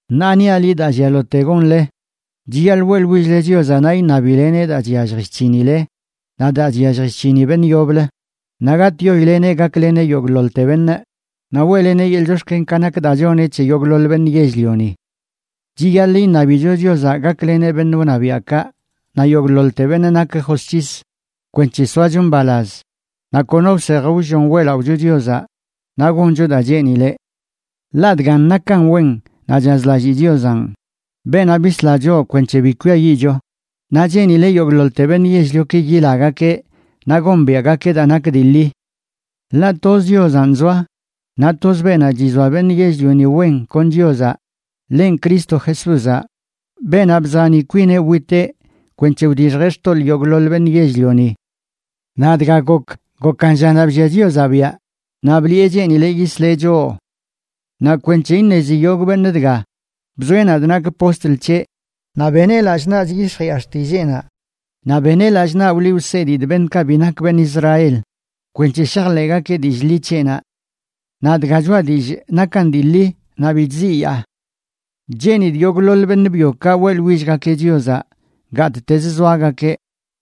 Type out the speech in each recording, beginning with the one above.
Ṉaa niaꞌ liꞌ daa llialote gonle: chiyaḻꞌ weꞌḻwill-le Chiozaꞌ naꞌ iṉabileneꞌ daa chyallj chc̱hinile naꞌ daa chyallj chc̱hini beṉꞌ yoblə, naꞌ gatꞌyoileꞌneꞌ gakleneꞌ yogꞌḻoḻte beṉꞌ, naꞌ weꞌleneꞌ yeḻꞌ chox̱ken ka nak daa choneꞌ c̱he yogꞌḻoḻ beṉꞌ yell-lioni. Chiyaḻꞌ iṉabicho Chiozaꞌ gakleneꞌ beṉꞌ wṉabiaꞌkaꞌ naꞌ yogꞌḻoḻte beṉꞌ nak josc̱his, kwenc̱he soacho mbalaz naꞌ kono wsej wllon weꞌlaꞌocho Chiozaꞌ naꞌ goncho daa cheenileꞌ. Ḻaꞌ dgan nakan wen naꞌ chazlalli Chiozanꞌ, beenaꞌ bisla choꞌ kwenc̱he bi kwiayiꞌcho, naꞌ cheenileꞌ yogꞌḻoḻte beṉꞌ yell-lioki yilagakeꞌ naꞌ gombiaꞌgakeꞌ daa nak dii ḻi. Ḻaꞌ toz Chiozanꞌ zoa, naꞌ toz beenaꞌ chizoa beṉꞌ yell-lioni wen kon Chiozaꞌ, ḻenꞌ Cristo Jesúzaꞌ, beenaꞌ bzani kwineꞌ witeꞌ kwenc̱he wdixjeꞌ xtoḻꞌ yogꞌḻoḻ beṉꞌ yell-lioni. Naꞌ dga gokə, gokan llanaꞌ bllia Chiozaꞌ biaꞌ, naꞌ bliꞌe cheenileꞌ yisleꞌ choꞌ. Naꞌ kwenc̱he iṉezi yogꞌ beṉꞌ dga, bzoeꞌ nadꞌ nakꞌ postl c̱heꞌ naꞌ beneꞌ lallꞌ naꞌ chyix̱jiꞌa xtilleenaꞌ. Naꞌ beneꞌ lallꞌ naꞌ wliꞌ wsedidꞌ beṉꞌkaꞌ bi nak beṉꞌ Israel, kwenc̱he shajḻeꞌgakeꞌ dillꞌ ḻi c̱heꞌnaꞌ. Naꞌ dga choꞌa dillꞌ nakan dii ḻi, naꞌ bi chziyaa. Cheenidꞌ yogꞌḻoḻ beṉꞌ byokaꞌ weꞌḻwillgakeꞌ Chiozaꞌ gattezə zoagakeꞌ,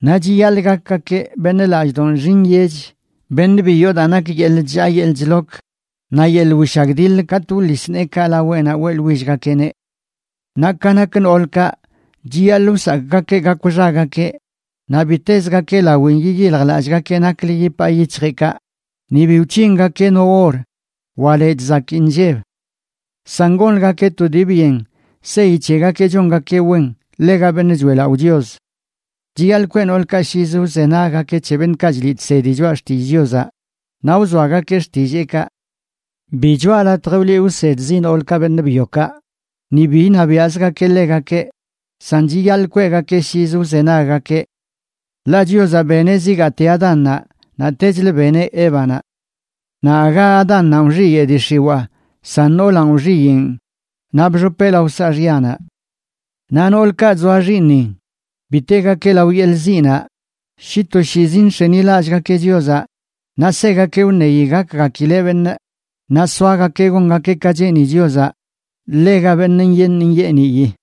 naꞌ chiyaḻꞌ gakgakeꞌ beṉꞌ lallꞌdoꞌ nxi nyech, beṉꞌ bi yoo daa nak yeḻꞌ chllaa yeḻꞌ chlok naꞌ yeḻꞌ wishagdiḻ katꞌ wḻis neekaꞌ laweꞌnaꞌ weꞌḻwillgakeꞌneꞌ. Naꞌ ka nak noolkaꞌ, chiyaḻꞌ wsakꞌgakeꞌ gakw xagakeꞌ, naꞌ bi tezgakeꞌ lawin yiyiljlallꞌgakeꞌ naklə yipaa yic̱hjeꞌkaꞌ, ni bi wc̱hingakeꞌ no or wa lechꞌ zakii inlleb. San gonləgakeꞌ to dii byen seyi c̱hegakeꞌ chongakeꞌ wen ḻega beṉꞌ choeꞌlaꞌo Chios. Chiyaḻꞌ kweꞌ noolkaꞌ llizə wzenaggakeꞌ c̱he beṉꞌkaꞌ chliꞌ chsedi choꞌa xtillꞌ Chiozaꞌ naꞌ wzoagakeꞌ xtilleekaꞌ. Bi choꞌa latj wliꞌ wsedzi noolkaꞌ beṉꞌ byokaꞌ, ni bi iṉabiaꞌzgakeꞌ ḻegakeꞌ, san chiyaḻꞌ kweꞌgakeꞌ llizə wzenaggakeꞌ. Ḻaꞌ Chiozaꞌ beneꞌ zigaate Adánnaꞌ, naꞌtechlə beneꞌ Évanaꞌ. Naꞌ aga Adánnanꞌ wxiyeꞌ dii xiwaa, san noolanꞌ wxiyeꞌn naꞌ bxopeꞌ lao saaxyanaꞌ. Naꞌ noolkaꞌ chzoa xiiṉin, bi tegakeꞌ lao yeḻꞌ ziꞌnaꞌ shi toshiizi nx̱enilallꞌgakeꞌ Chiozaꞌ, naꞌ segakeꞌ wṉeyi gakgakileꞌ beṉꞌ, naꞌ soagakeꞌ gongakeꞌ ka cheeni Chiozaꞌ ḻega beṉꞌ nyeeṉ nyeeniyi.